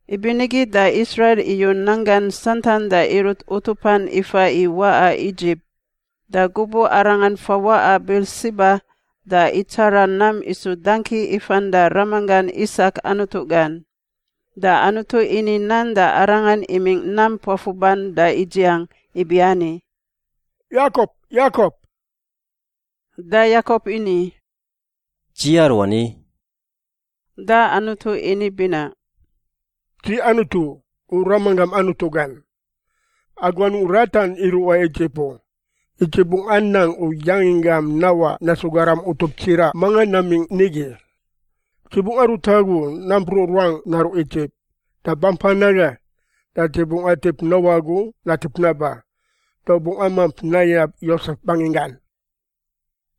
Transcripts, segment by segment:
Ibinigi da Israil iyu nanggan santan da irut utupan ifa i waꞌa Idzip, da gubuꞌ arangan fawaꞌa Birsiba da itsara nam isu dangki ifan da ramanggan Isak Anutu gan. Da Anutu ini nan da arangan imingꞌ nam puafuban da idziang ibiani, “Yakop! Yakop!” Da Yakop ini, “Dzi aruani!” Da Anutu ini binaꞌ, “Dzi Anutu, u ramanggam Anutu gan. Agu anungꞌ ratan i ruꞌa Idzip u, i dzi bungꞌ anang u yanginggam nawaꞌ nasu garam utup tsiraꞌ mangan namingꞌ nigi. Dzi bungꞌ arut agu nampruꞌ ruangꞌ naruꞌ Idzip, da bampan naga da dzi bungꞌ atip nau agu natip naba. Da u bungꞌ amamp nayab Yosef banginggan.”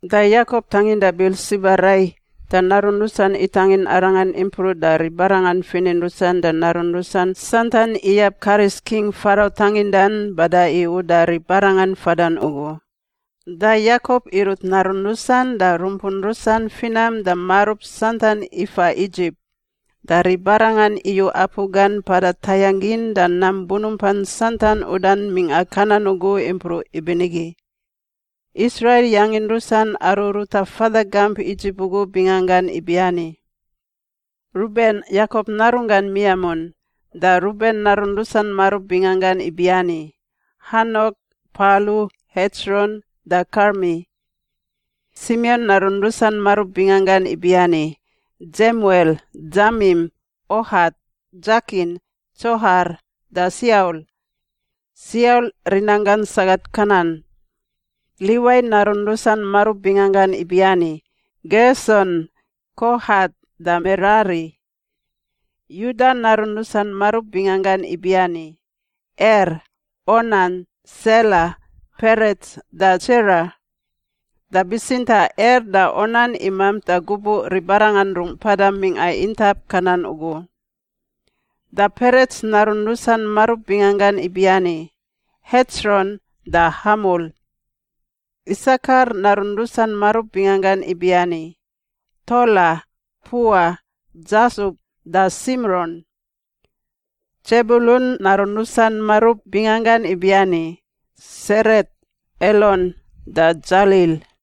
Da Yakop tanginda Birsiba rai, da narun rusan itangin arangan impruꞌ da ribarangan finin rusan da narun rusan santan iyab karis King Farau tangindan bada i uda ribarangan fadan ugu. Da Yakop irut narun rusan da rumpun rusan finam da marub santan ifa Idzip. Da ribarangan iyu apu gan mpada tayangꞌ gin da nam bunumpan santan udan mingꞌa Kanan ugu impruꞌ ibinigi. Israil yangin rusan aru ruta fada gamp Idzip ugu binganggan ibiani: Ruben, Yakop narunggan miamun. Da Ruben narun rusan marub binganggan ibiani, Hanok, Palu, Hetsron da Karmi. Simion narun rusan marub binganggan ibiani, Dzemuel, Dzamin, Ohat, Dzakin, Tsohar da Siaul. Siaul rinanggan sagat Kanan. Liwai narun rusan marub binganggan ibiani, Gerson, Kohat da Merari. Yuda narun rusan marub binganggan ibiani, Er, Onan, Sela, Perets da Tsera. (Da bitsintaꞌ Er da Onan imamp da gubuꞌ ribarangan rungꞌ mpada mingꞌa intap Kanan ugu.) Da Perets narun rusan marub binganggan ibiani, Hetsron da Hamul. Isakar narun rusan marub binganggan ibiani, Tola, Pua, Dzasup da Simron. Tsebulun narun rusan marub binganggan ibiani, Seret, Elon da Dzalil.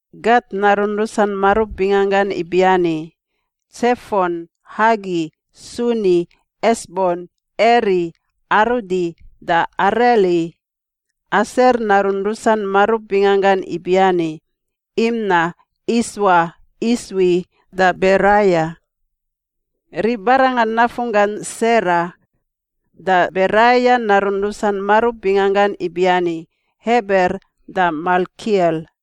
Gat narun rusan marub binganggan ibiani, Tsefon, Hagi, Suni, Esbon, Eri, Arodi da Areli. Aser narun rusan marub binganggan ibiani, Imna, Iswa, Iswi da Beraia. Ribarangan nafunggan Sera. Da Beraia narun rusan marub binganggan ibiani, Heber da Malkiel.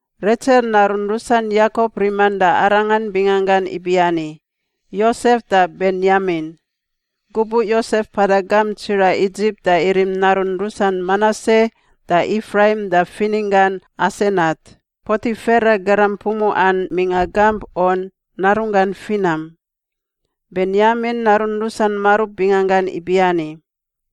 Retsel narun rusan Yakop riman da arangan binganggan ibiani: Yosef da Benyamin. Gubuꞌ Yosef mpada gamp tsiraꞌ Idzip da irim narun rusan Manase da Ifraim da fininggan Asenat, Potifera garam pumuꞌan mingꞌa gamp On narunggan finam. Benyamin narun rusan marub binganggan ibiani: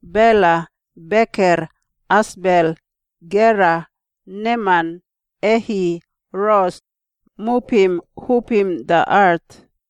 Bela, Beker, Asbel, Gera, Neman, Ehi, Ros, Mupim, Hupim da Art.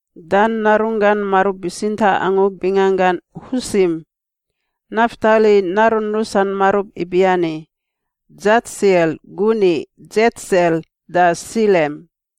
Dan narunggan marub bitsintaꞌ angu binganggan Husim. Naftali narun rusan marub ibiani: Dzatsiel, Guniꞌ, Dzetser da Silem.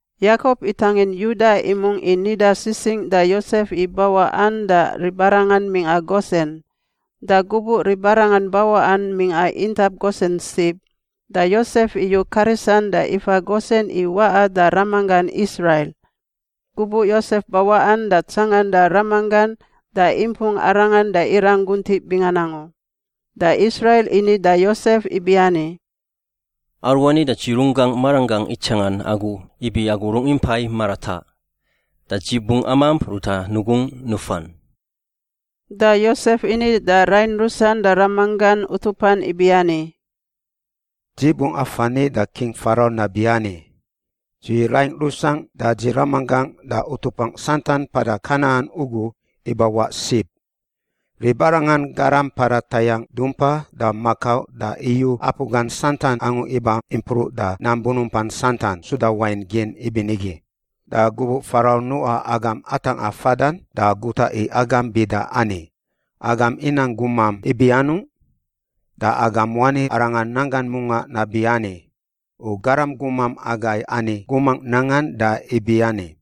Yakop itangin Yuda imungꞌ i nida sisingꞌ da Yosef i bawaꞌan da ribarangan mingꞌa Gosen. Da gubuꞌ ribarangan bawaꞌan mingꞌa intap Gosen sib, da Yosef iyu karisan da ifa Gosen i waꞌa da ramanggan Israil. Gubuꞌ Yosef bawaꞌan da tsanganda ramanggan da impung arangan da irang guntiꞌ bingan angu. Da Israil ini da Yosef ibiani, “Aruani da dzi runggangꞌ maranggangꞌ itsangan agu ibi agu rungꞌ impai marataꞌ, da dzi bungꞌ amamp ruta nugungꞌ nufan.” Da Yosef ini da rain rusan da ramanggan utupan ibiani, “Dzi bungꞌ afani da King Farau nabiani, ‘Dzi raingꞌ rusangꞌ da dzi ramanggangꞌ da utupan santan mpada Kanan ugu ibawaꞌ sib. Ribarangan garam mpada tayangꞌ dumpa da makau da iyu apu gan santan angu iba impruꞌ da nam bunumpan santan suda wain gin ibinigi.’ Da gubuꞌ Farau nuꞌa agam atangꞌa fadan da guta i agam bida ani, ‘Agam inang gumam ibi anungꞌ?’ da agam wani arangan nan gan mungaꞌ nabiani, ‘U garam gumam agai ani gumangꞌ nangan da ibiani,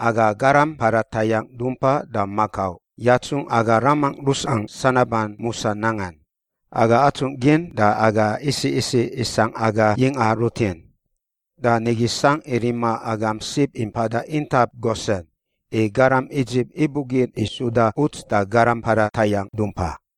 aga garam mpada tayangꞌ dumpa da makau, yatsungꞌ aga ramangꞌ rusan sanaban musa nangan. Aga atsungꞌ gin da aga isi isiꞌ isangꞌ aga yingꞌa rutin.’ Da nigi sangꞌ i rima agam sib i mpada intap Gosen, i garam Idzip ibugin i suda uts da garam mpada tayangꞌ dumpa.”